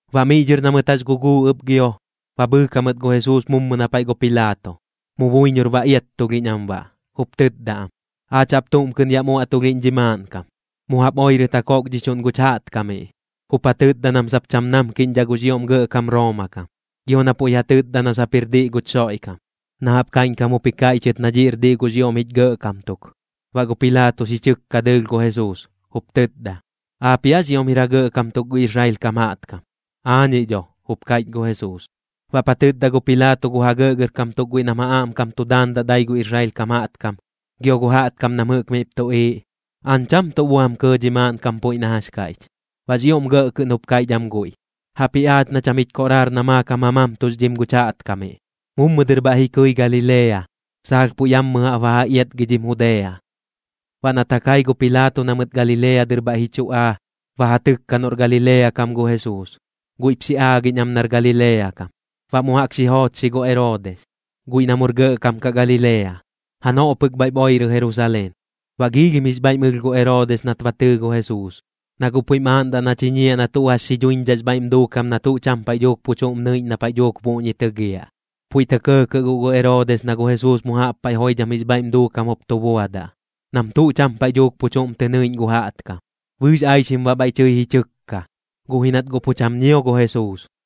Baꞌ miꞌ dhɨr na mɨt jax guguu ɨp gio, ba bhɨɨk jamɨt gu Jesuus mummɨ na paiꞌ gu Pilaato. Mu buiñor ba iattulhiꞌñ am baꞌ, jup tɨtda am: ―Aach jaꞌp tuꞌm kɨꞌn yaꞌm uaꞌtulhiꞌñ dhi maaꞌnkam. Mu jaꞌp oirɨt ja kokdhichuꞌn guch jaꞌtkamiꞌ, jup ja tɨtda nam sap cham namkiꞌñdhaꞌ gux ioꞌm gɇꞌkam Rooma kam. Gio na puiꞌ ja tɨtda na sap jir diꞌ guch Xoiꞌkam, na jaꞌp kaiꞌñkam jup ji kaiꞌchɨt na dhiꞌr diꞌ gux ioꞌm jich gɇꞌkam tuk. Baꞌ gu Pilaato xi chɨkka dɨɨlh gu Jesuus, jup tɨtda: ―¿Aapiꞌ aax ioꞌm jir ja gɇꞌkam tuk gu Israel kam jaꞌtkam? ―Aañiꞌ dho ―jup kaiꞌch gu Jesuus. Baꞌp ja tɨtda gu Pilaato gu ja gɇꞌgɇrkam tuk guiꞌ nam ja aꞌmkam tu daandaꞌ dai gu Israel kam jaꞌtkam, gio gu jaꞌtkam nam jɨꞌk miꞌp tuꞌiiꞌ: ―Aañ cham tuꞌ buam kɇɇ dhi maaꞌnkam puiꞌ na jax kaiꞌch. Baꞌx ioꞌm gɇꞌ kɨꞌn jup kaiꞌch am guiꞌ: ―Jaꞌpji aach na cham jich koꞌraar na maakam ja mamtuxdhim guch jaꞌtkamiꞌ. Mummɨ dɨr bhaiꞌ ji kɨi Galilea, saalh puiꞌ yammɨ jaꞌp ba ja iatgidhim Judea. Baꞌ nat ja kai gu Pilaato na mɨt Galilea dɨr bhaiꞌ ji chu aa, ba ja tɨkka noꞌr Galilea kam gu Jesuus. Guiꞌp xi aagiꞌñ am nar Galilea kam. Baꞌ mu jaꞌk xi joochxi gu Eroodis, guiꞌ na mur gɇꞌkam kaꞌ Galilea. Janoꞌ pɨk bhaiꞌp oirɨ Jerusaleen. Baꞌ giilhim jix bhaiꞌm ɨlh gu Eroodis nat ba tɨɨ gu Jesuus, na guꞌ puiꞌm aaꞌndaꞌ na chiñiaꞌ na tuꞌ jax xi dhuiñdhaꞌx bhaiꞌm duukam na tuꞌ cham paiꞌ dhuuk pu chuꞌm nɨiꞌñ na paiꞌ dhuuk puꞌñi tɨgiaꞌ. Puiꞌ tɇ kɇɇkɇꞌ guꞌ gu Eroodis na gu Jesuus mu jaꞌp paiꞌ joidham jix bhaiꞌm duukam jup tu buadaꞌ, nam tuꞌ cham paiꞌ dhuuk pu chuꞌm tɨ nɨiꞌñ gu jaꞌtkam. Bɨɨx aixim baꞌ bhaiꞌ tɨi ji tɨkka, guꞌ ji nat guꞌ pu cham ñio gu Jesuus.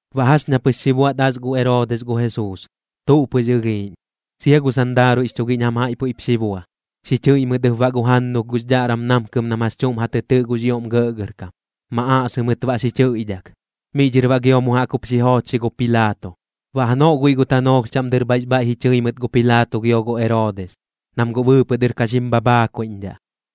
Baꞌ jax ña pɨx xi buaꞌt as gu Eroodis gu Jesuus, tuꞌ pɨx ɨlhiiꞌñ. Sia gu sandaaruiꞌx chugiꞌñ jam jaiꞌ puiꞌp xi bua. Xi chɨiꞌ mɨt ɨp baꞌ gu jannulh gux dhaꞌram namkɨm nam jax chuꞌm ja tɨ tɨꞌ gux ioꞌm gɇꞌgɇrkam, ma aꞌsɨ mɨt baꞌ xi chɨiꞌdhak. Miꞌ dhɨr baꞌ gio mu jaꞌk jup xi joochxi gu Pilaato. Baꞌ janoꞌ guiꞌ gu tanoolh chaꞌm dɨr bhaiꞌx bhaiꞌ ji chɨi mɨt gu Pilaato gio gu Eroodis, nam guꞌ bɨɨpɨꞌ dɨr ka xim bhabhaakuiꞌñdhaꞌ.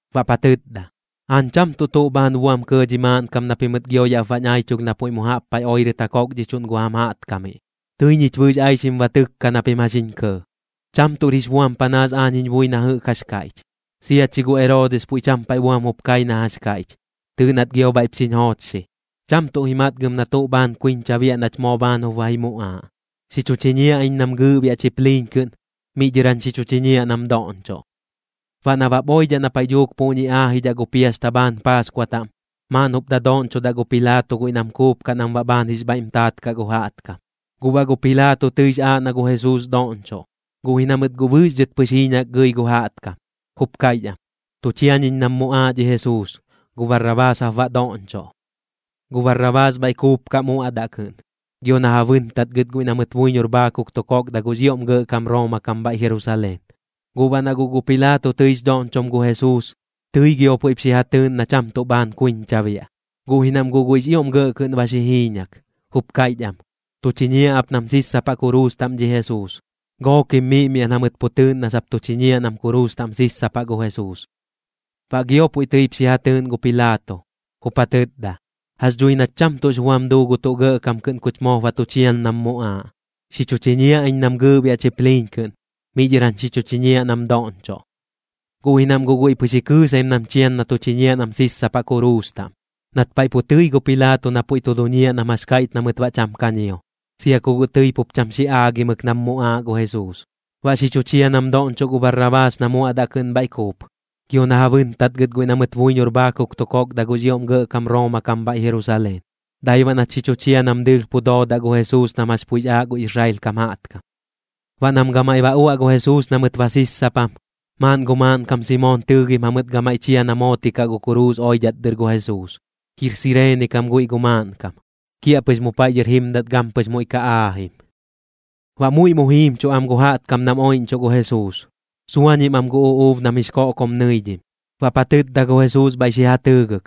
baꞌp ja tɨtda: ―Aañ cham tuꞌ tuꞌ bhaan buam kɇɇ dhi maaꞌnkam na pimɨt gio yaꞌp bañ aichulh na puiꞌ mu jaꞌp paiꞌ oirɨt ja kokdhichuꞌn gu jam jaꞌtkamiꞌ. Tɨi ñich bɨɨx aixim ba tɨkka na pim jax jiñ kɇɇ, cham tuꞌr jix buam panaas aañ jiñ bui na jɨꞌk jax kaiꞌch. Sia chi gu Eroodis puiꞌ cham paiꞌ buam jup kai na jax kaiꞌch, tɨɨꞌ nat gio bhaiꞌp xiñ joochxi. Cham tuꞌ ji matgɨm na tuꞌ bhaan kuiñcha biaꞌ nach moo bhaan jup ba ji muꞌaaꞌ. Xi chu chiñiaꞌ iñ nam gɨɨꞌbiaꞌ chipliiñ kɨꞌn, miꞌ dhɨr jañ xi chu chiñiaꞌ nam doꞌñchoꞌ. Baꞌ nabap oidhaꞌ na paiꞌ dhuuk puꞌñi aajidhaꞌ gu piasta bhaan Paaskua taꞌm, maaꞌn jup dadoꞌñchodaꞌ gu Pilaato guiꞌ nam kuupkaꞌ nam baꞌ bhaan jix bhaiꞌm taat kaꞌ gu jaꞌtkam. Guꞌ baꞌ gu Pilaato tɨix aaꞌ na gu Jesuus doꞌñchoꞌ, guꞌ ji na mɨt guꞌ bɨɨx dhɨt pɨx jiiñak gɨi gu jaꞌtkam, jup kaiꞌch am: ―Tu chiañiñ nam muꞌaaꞌ dhi Jesuus, gu Barrabaas jap baꞌ doꞌñchoꞌ. Gu Barrabaas bhaiꞌ kuupkaꞌ muaꞌdaꞌ kɨꞌn, gio na ja bɨntatgɨt guiꞌ na mɨt buiñor bhaakuk tu kokda gux ioꞌm gɇꞌkam Rooma kam bhaiꞌ Jerusaleen. Guꞌ baꞌ na guꞌ gu Pilaato tɨix dhoꞌñchom gu Jesuus, tɨi gio puiꞌp xi ja tɨɨꞌn na cham tuꞌ bhaan kuiñcha biaꞌ. Guꞌ ji nam guꞌ guiꞌx ioꞌm gɇꞌ kɨꞌn ba xi jiiñak, jup kaiꞌch am: ―¡Tu chiñiaꞌ ap nam sissapaꞌ kuruus taꞌm dhi Jesuus! Gookim miꞌmiaꞌn jamɨt pu tɨɨꞌn na sap tu chiñiaꞌ nam kuruus taꞌm sissapaꞌ gu Jesuus. Baꞌ gio puiꞌ tɨip xi ja tɨɨꞌn gu Pilaato, jup ja tɨtda: ―Jax dhui nat cham tuꞌx buam duu gu tuꞌ gɇꞌkam kɨꞌn kuch moop ba tu chian nam muꞌaaꞌ. Xi chu chiñiaꞌ iñ nam gɨɨꞌbiaꞌ chipliiñ kɨꞌn, miꞌ dhɨr jañ xi chu chiñiaꞌ nam doꞌñchoꞌ. Guꞌ ji nam guꞌ guiꞌ pɨx ji kɨɨsaim nam chian na tu chiñiaꞌ nam sissapaꞌ kuruus taꞌm. Nat paiꞌ pu tɨi gu Pilaato na puiꞌ tu duñiaꞌ nam jax kaiꞌch na mɨt baꞌ cham ka ñio, sia ku guꞌ tɨi pup cham xi aagimɨk nam muꞌaaꞌ gu Jesuus. Baꞌ xi chu chia nam doꞌñchoꞌ gu Barrabaas na muaꞌdaꞌ kɨꞌn bhaiꞌ kuup, gio na ja bɨntatgɨt guiꞌ na mɨt buiñor bhaakuk tu kokda gux ioꞌm gɇꞌkam Rooma kam bhaiꞌ Jerusaleen, dai baꞌ nat xi chu chia nam dɨɨlh pu doodaꞌ gu Jesuus nam jax puiꞌx aaꞌ gu Israel kam jaꞌtkam. Baꞌ nam gamaiꞌ ba uaꞌ gu Jesuus na mɨt ba sissapam, maaꞌn gu maaꞌnkam Simoon tɨɨgim jamɨt gamaiꞌ chia na mootikaꞌ gu kuruus oidhat dɨr gu Jesuus. Jir Sireene kam guiꞌ gu maaꞌnkam, kiaꞌpɨx mu paiꞌ dhɨr jimdat gampɨx muiꞌ ka aajim. Baꞌ muiꞌ mu jiimchuꞌ am gu jaꞌtkam nam oiꞌñchuꞌ gu Jesuus, suañim am gu uꞌuub nam jix koꞌkom nɨidhim. Baꞌp ja tɨtda gu Jesuus bhaiꞌ xi ja tɨɨgɨk: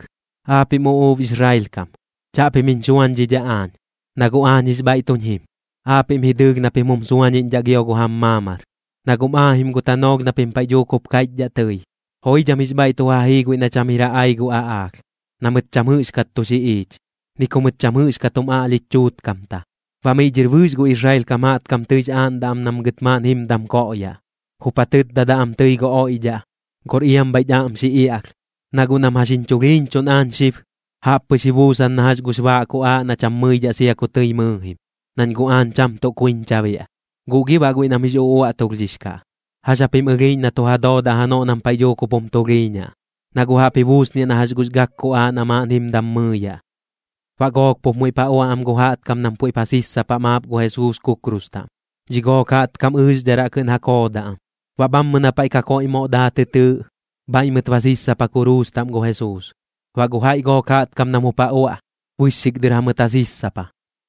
―Aapiꞌm uꞌuub Israel kam, chaꞌpim jiñ xuañdhidhaꞌ aañ, na guꞌ aañ jix bhaiꞌ tuñ jim. Aapiꞌm ji dɨɨlh na pim jum suañiꞌñdhaꞌ gio gu jam maamar. Na guꞌm aajim gu tanoolh na pim paiꞌ dhuuk jup kaiꞌchdhaꞌ tɨi: “Joidham jix bhaiꞌ tu ja jii guiꞌ na cham jir ja ai gu aꞌaalh, na mɨt cham jɨꞌxkat tu xiꞌiich, ni ku mɨt cham jɨꞌxkat jum aꞌlhich chuutkamta.” Baꞌ miꞌ dhɨr bɨɨx gu Israel kam jaꞌtkam tɨix aaꞌndaꞌ am nam gɨt maaꞌn jimdam koꞌyaꞌ. Jup ja tɨtdadaꞌ am tɨi gu oiꞌdhaꞌ: “Gor iam bhaiꞌch aꞌm xi iaꞌlh.” Na guꞌ nam jax jiñ chulhiiñchuꞌn aañ xib, jaꞌp pɨx ji buusan na jax gux baaꞌ kuꞌaaꞌ na cham mɨidhaꞌ sia ku tɨi mɨɨjim, nañ guꞌ aañ cham tuꞌ kuiñcha biaꞌ. Guꞌ gi baꞌ guiꞌ nam jix uꞌuaꞌtulhdhix kaꞌ, ¿jax japim ɨlhiiꞌñ na tu ja doodaꞌ janoꞌ nam paiꞌ dhuuk jup jum tulhiiñaꞌ? Na guꞌ jaꞌp ji buusniaꞌ na jax gux gak kuꞌaaꞌ na maaꞌn jimdam mɨɨyaꞌ. Baꞌ gook pup muiꞌp ja uaꞌ am gu jaꞌtkam nam puiꞌp ja sissapaꞌ maap gu Jesuus kukrus taꞌm. Dhi gook jaꞌtkam ɨɨxdharaꞌ kɨꞌn ja koodaꞌ am. Baꞌ bhammɨ na paiꞌ Kakoiꞌ Moꞌ Daa tɨ tɨɨꞌ, bhaiꞌ mɨt ba sissapa kuruus taꞌm gu Jesuus. Baꞌ gu jaiꞌ gook jaꞌtkam nam jup ja uaꞌ, bɨxxik dɨr jamɨt ja sissapa,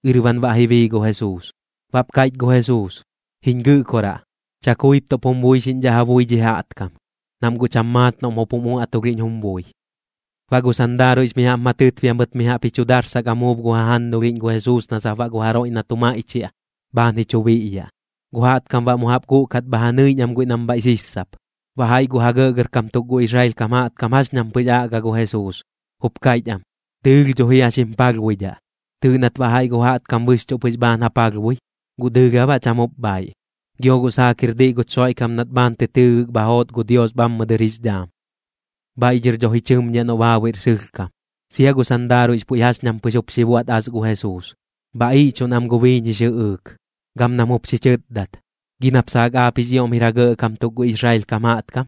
ɨrban baꞌ ji bii gu Jesuus. Baꞌp kaiꞌch gu Jesuus: ―Jiñ Gɨꞌkoraꞌ, chakuip tuꞌp jum buixiꞌñdhaꞌ ja bui dhi jaꞌtkam, nam guꞌ cham maat noꞌm jup jum uaꞌtulhiꞌñ jum bui. Baꞌ gu sandaaruiꞌx mi jaꞌp ma tɨtbia mɨt mi jaꞌp ji chu darsak amuub gu jajannulhiꞌñ gu Jesuus na sap baꞌ gu jaroiꞌ na tu maiꞌchiaꞌ, bhaan ji chu biꞌyaꞌ. Gu jaꞌtkam baꞌ mu jaꞌp guꞌkat bha ja nɨiꞌñ am guiꞌ nam bhaiꞌ sissap. Baꞌ jaiꞌ gu ja gɇꞌgɇrkam tuk gu Israel kam jaꞌtkam jax ñam pɨx aꞌga gu Jesuus, jup kaiꞌch am: ―Dɨɨlh dho jia xim palhbuidhaꞌ. Tɨɨꞌ nat baꞌ jaiꞌ gu jaꞌtkam bɨxchuꞌ pɨx bhaan ja palhbui. ¿Guꞌ dɨɨlh aa baꞌ cham jup bhaaiꞌ? Gio guꞌ saak jir diꞌ guch Xoiꞌkam nat bhaan tɨ tɨɨgɨk bha joot gu Dios bhammɨ dɨr jix dhaam. Bhaiꞌ dhɨr dho ji chɨmñiaꞌ noꞌ baabuiꞌr sɨlhkam. Sia gu sandaaruiꞌx puiꞌ jax ñam pɨx jup xi buaꞌt as gu Jesuus, bha iꞌchuꞌn am gu biiñ jix jɨꞌɨɨk. Gam nam jup xi chɨtdat: ―¿Gi nap saak aap jix ioꞌm jir ja gɇꞌkam tuk gu Israel kam jaꞌtkam?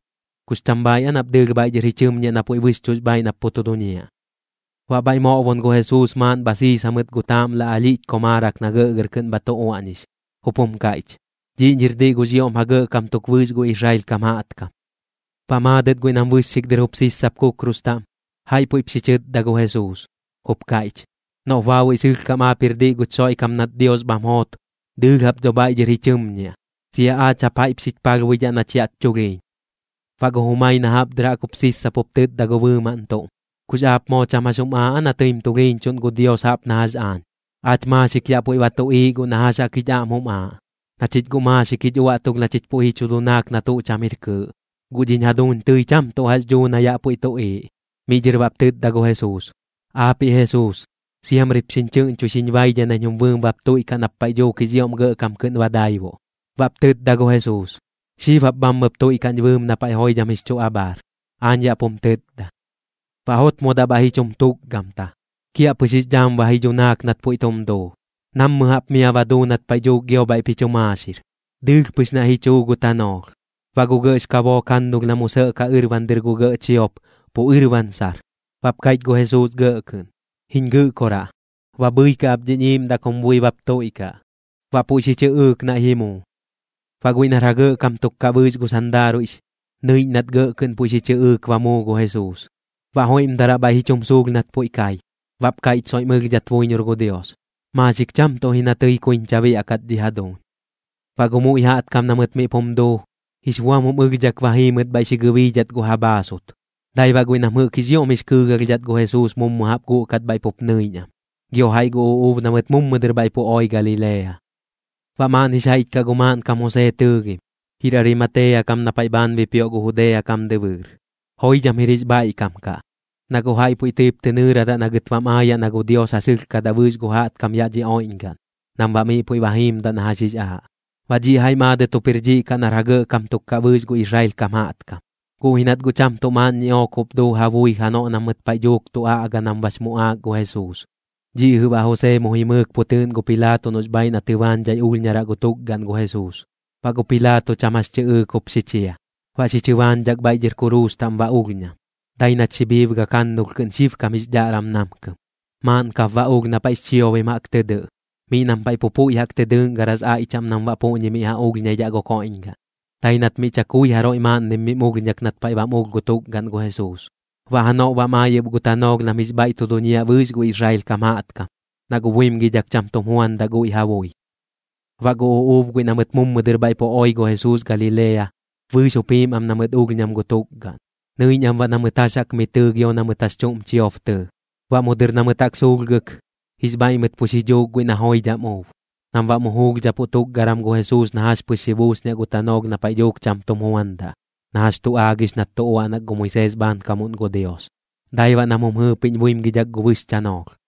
¿Kux cham bhaaiꞌ aa nap dɨɨlh bhaiꞌ dhɨr ji chɨmñiaꞌ na puiꞌ bɨxchuꞌx bhaaiꞌ nap pu tu duñiaꞌ? Baꞌ bhaiꞌ moꞌbon gu Jesuus maaꞌn bha siis jamɨt gu taaꞌmla alhiꞌch komaarak na gɇꞌgɇr kɨꞌn bha tu uaꞌñix, jup jum kaiꞌch: “Dhiꞌñir diꞌ gux ioꞌm ja gɇꞌkam tuk bɨɨx gu Israel kam jaꞌtkam.” Baꞌ maadɨt guiꞌ nam bɨxxik dɨr jup sissap kukrus taꞌm, jaiꞌ puiꞌp xi chɨtda gu Jesuus, jup kaiꞌch: ―Noꞌp baabuiꞌ sɨlhkam aap jir diꞌ guch Xoiꞌkam nat Dios bham joot, dɨɨlh jap dho bhaiꞌ dhɨr ji chɨmñiaꞌ, sia aach jap jaiꞌp xich palhbuidhaꞌ nach yaꞌch chulhiiñ. Baꞌ gu jumai na jaꞌp dɨr jaꞌk jup sissap jup tɨtda gu bɨɨmaꞌn tuꞌm: ―¿Kux aap moo cham jax jum aaꞌ aa na tɨim tulhiiñchuꞌn gu Dios jaꞌp na jax aañ? Aach maaxik yaꞌ puiꞌ ba tuꞌiiꞌ guꞌ na jax jaꞌk jich aꞌm jum aaꞌ, na chich guꞌ maaxik jich uaꞌtulh na chich puiꞌ ji chu dunaak na tuꞌ cham jir kɨɨꞌ. Guꞌ dhiñ jaduuñ tɨi cham tuꞌ jax dhuu na yaꞌ puiꞌ tuꞌiiꞌ. Miꞌ dhɨr baꞌp tɨtda gu Jesuus: ―Aapiꞌ Jesuus, siamrip xiñ chɨꞌñchoi xiñ baidhai nañ jum bui bap tuiꞌkaꞌ nap paiꞌ dhuuk jix ioꞌm gɇꞌkam kɨꞌn ba daibuꞌ. Baꞌp tɨtda gu Jesuus: ―Xib jap bhammɨp tuiꞌkaꞌñ bɨɨm na paiꞌ joidham jix chu abhaar. Aañ yaꞌ pum tɨtda. Baꞌ jotmodaꞌ bhaiꞌ ji chum tukgamta. Kiaꞌpɨx jix dhaam ba ji dhunaak nat puiꞌ tum duu, nammɨ jaꞌp mia ba duu nat paiꞌ dhuuk gio bhaiꞌp ji chu maaxir. Dɨɨlh pɨx naiꞌ ji chuu gu tanoolh. Baꞌ gu gɇꞌx kabook jannulh na mu sɇꞌkaꞌ ɨrban dɨr gu gɇꞌ chiop, pu ɨrban sar. Baꞌp kaiꞌch gu Jesuus gɇꞌ kɨꞌn: ―Jiñ Gɨꞌkoraꞌ, ba bhɨikaꞌ ap dhiñ iiꞌmdaꞌ kum bui bap tuiꞌkaꞌ. Baꞌ puiꞌ xi chɨꞌɨɨk naiꞌ ji muu. Baꞌ guiꞌ nar ja gɇꞌkam tuk kaꞌ bɨɨx gu sandaaruiꞌx, nɨiꞌñ nat gɇꞌ kɨꞌn puiꞌ xi chɨꞌɨɨk ba muu gu Jesuus. Baꞌ joiꞌmdaraꞌ bhaiꞌ ji chum suulh nat puiꞌ kai, baꞌp kaiꞌch soiꞌm ɨlhdhat buiñor gu Dios: ―Maaxik cham tuꞌ ji na tɨi kuiñcha biaꞌkat dhi jaduuñ. Baꞌ gu muiꞌ jaꞌtkam na mɨt miꞌp jum duu, jix buam jum ɨlhdhak ba jii mɨt bhaiꞌ xi gɨbiidhat gu ja bhaasut. Dai baꞌ guiꞌ nam jɨꞌk jix ioꞌm jix kɨɨgalhdhat gu Jesuus mummɨ jaꞌp guꞌkat bhaiꞌ pup nɨiꞌñ am, gio jaiꞌ gu uꞌuub na mɨt mummɨ dɨr bhaiꞌ pu oi Galilea. Baꞌ maaꞌn jix jaiꞌch kaꞌ gu maaꞌnkam Josee tɨɨgim, jir Arimatea kam na paiꞌ bhaan bipioꞌ gu Judea kam dɨbɨɨr. Joidham jir jix bhaiꞌkam kaꞌ, na guꞌ jaiꞌ puiꞌ tɨip tɨ nɨɨradaꞌ na gɨt bam aayaꞌ na gu Dios ja sɨlhkadaꞌ bɨɨx gu jaꞌtkam yaꞌ dhi oiꞌñgaꞌn, nam baꞌ miꞌ puiꞌ ba jiimdaꞌ na jax jix aaꞌ. Baꞌ dhiꞌ jaiꞌ maadɨt jup jir dhiꞌ kaꞌ nar ja gɇꞌgɇrkam tuk kaꞌ bɨɨx gu Israel kam jaꞌtkam, guꞌ ji nat guꞌ cham tuꞌ maaꞌn ñiꞌook jup duu ja bui janoꞌ na mɨt paiꞌ dhuuk tu aꞌga nam bax muꞌaak gu Jesuus. Dhiꞌ jɨꞌ baꞌ Josee mu jimɨɨk pu tɨɨꞌn gu Pilaato noꞌx bhaaiꞌ na tɨbaañdhai ulhñaraꞌ gu tukgaꞌn gu Jesuus. Baꞌ gu Pilaato cham jax tɨꞌɨɨk jup xi chia. Baꞌ xi chɨbaañdhak bhaiꞌ dhɨr kuruus taꞌm ba ulhñam, dai nat xi bhiibgak jannulh kɨꞌn xibkam jix dhaꞌram namkɨm. Maaꞌn kap baꞌ ulh na paiꞌx chiobim jaꞌk tɨ dɨꞌ, miꞌ nam paiꞌ pu puiꞌ jaꞌk tɨ dɨꞌngaras aiꞌ chaꞌm nam baꞌ puꞌñi miꞌ ja ulhñaidhaꞌ gu koiꞌñgaꞌn. Dai nat miꞌ chakui jaroiꞌ maaꞌnnim mim ulhñak nat paiꞌ bam ulh gu tukgaꞌn gu Jesuus. Baꞌ janoꞌ bam ai ɨp gu tanoolh nam jix bhaiꞌ tu duñiaꞌ bɨɨx gu Israel kam jaꞌtkam, na guꞌ buimgidhak cham tum juandaꞌ guiꞌ ja bui. Baꞌ gu uꞌuub guiꞌ na mɨt mummɨ dɨr bhaiꞌ pu oi gu Jesuus Galilea, bɨɨx jup jiim am na mɨt ulhñam gu tukgaꞌn. Nɨiꞌñ am baꞌ na mɨt jax jaꞌk mi tɨɨ gio na mɨt jax chuꞌm chiob tɨɨ. Baꞌ mu dɨr na mɨt jaꞌk suulhgɨk, jix bhaiꞌ mɨt pu xi dhuuk guiꞌ na joidham uub, nam baꞌ mu juulhdhapuꞌ tukgaram gu Jesuus na jax pɨx xi buusniaꞌ gu tanoolh na paiꞌ dhuuk cham tum juandaꞌ, na jax tu aagix nat tu uaꞌnak gu Moisees bhaankamuꞌn gu Dios. Dai baꞌ nam jum jɨɨpiꞌñ buimgidhak gu bɨx chanoolh.